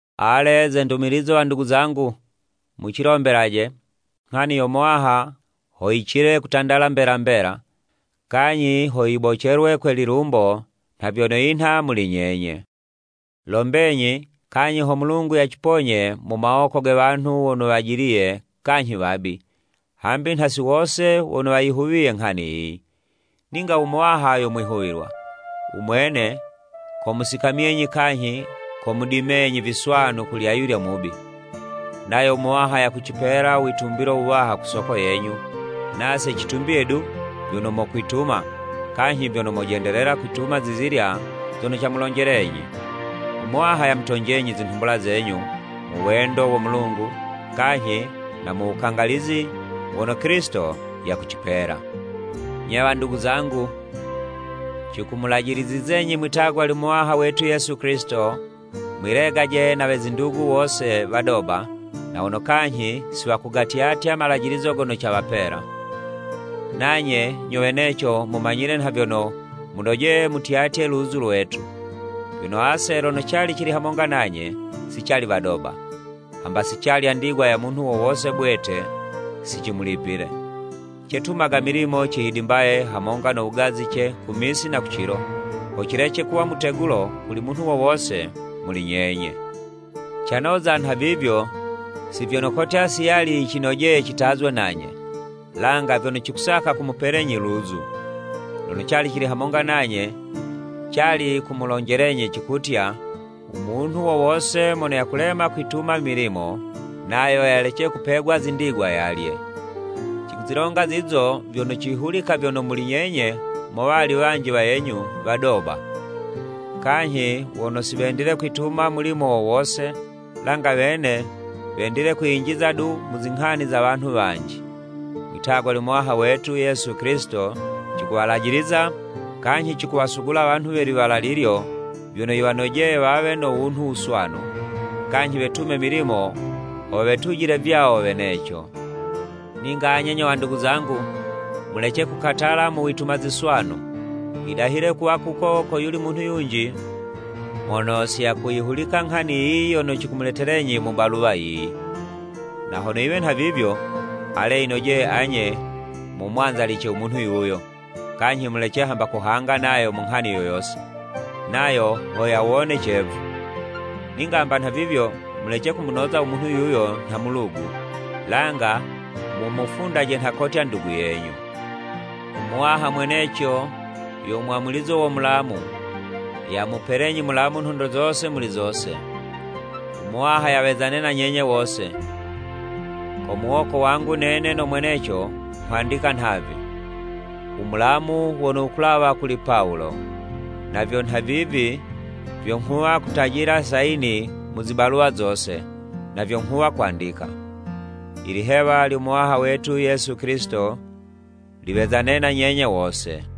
Ale, ze ndumilizo wandugu zangu, mucilombelaje, nghani yo Muwaha ho yicile kutandala mbela mbela, kanyhi ho yibocelwe kwe lilumbo nha vyono yinha muli nyenye. Lombenyi, kanyhi ho Mulungu yaciponye mu mawoko ge wanhu wono wajiliye kanyhi wabi, hambi nha si wose wono wayihuwiye nghani yiyi. Ninga u Muwaha yo mwihuwilwa. U Mwene komusikamyenyi kanyhi komudimenyi viswanu kuli ayulya mubi. Nayo u Muwaha yakucipela u witumbilo wuwaha ku soko yenyu, nase citumbiye du vyono mokwituma, kanyhi vyono mojendelela kwituma zizilya zono camulonjelenyi. U Muwaha yamutonjenyi zinhumbula zenyu mu wendo wo Mulungu, kanyhi na mu wukangalizi wono Kilisito yakucipela. Nye wandugu zangu, cikumulajilizizenyi mwi'tagwa lyo Muwaha wetu Yesu Kilisito, mwilegaje na we zindugu wose wadoba na wono kanyhi si wakugatyatya malajilizo gono cawapela. Nanye nyo weneco mumanyile nha vyono munojeye mutyatye luzu lwetu. Vyono ase lono cali cili hamonga nanye, si cali wadoba. Hamba si calya ndigwa ya munhu wo wose bwete si cimulipile. Cetumaga milimo cihidimbaye hamonga no wugazice ku misi na ku cilo, ho cilece kuwa mutegulo kuli munhu wo wose muli nyenye. Canoza nhavivyo, si vyono kotya si yali yicinojeye citazwe nanye, langa vyono cikusaka kumupelenyi luzu. Lono cali cili hamonga nanye, cali kumulonjelenyi cikutya, “U munhu wo wose mono yakulema kwituma i milimo, nayo yalece kupegwa zindigwa yalye.” Cikuzilonga zizo vyono cihulika vyono muli nyenye mo wali wanji wayenyu wadoba kanyhi wono si wendile kwituma mulimo wo wose, langa wene wendile kwiyinjiza du mu zinghani za wanhu wanji. Mwitagwa lyo Muwaha wetu Yesu Kilisito, cikuwalajiliza kanyhi cikuwasugula wanhu we liwala lilyo vyono yiwanojeye wawe no wunhu wuswanu, kanyhi wetume milimo ho wetujile vyawo weneco. Ninga anye nyo wandugu zangu, mulece kukatala mu wituma ziswanu. Yidahile kuwa kuko koyuli munhu yunji mono si yakuyihulika nghani yiyi yono cikumuletelenyi mu baluwa yiyi. Na hono yiwe nhavivyo, ale yinojeye anye mumwanzalice u munhu yuyo, kanyhi mulece hamba kuhanga nayo mu nghani yo yose, nayo ho yawone cevu. Ninga hamba nhavivyo, mulece kumunoza u munhu yuyo nha mulugu, langa mumufundaje nha kotya ndugu yenyu. U Muwaha mweneco, yo mwamulizo wo mulamu, yamupelenyi mulamu nhondo zose muli zose. U Muwaha yawezane na nyenye wose. Ko muwoko wangu nene no mweneco nghwandika nhavi: U mulamu wono wukulawa kuli Pawulo! Navyo nhavivi vyo nghuwa kutajila sayini mu zi baluwa zose, na vyo nghuwa kwandika. Ilihewa lyo Muwaha wetu Yesu Kilisito liwezane na nyenye wose.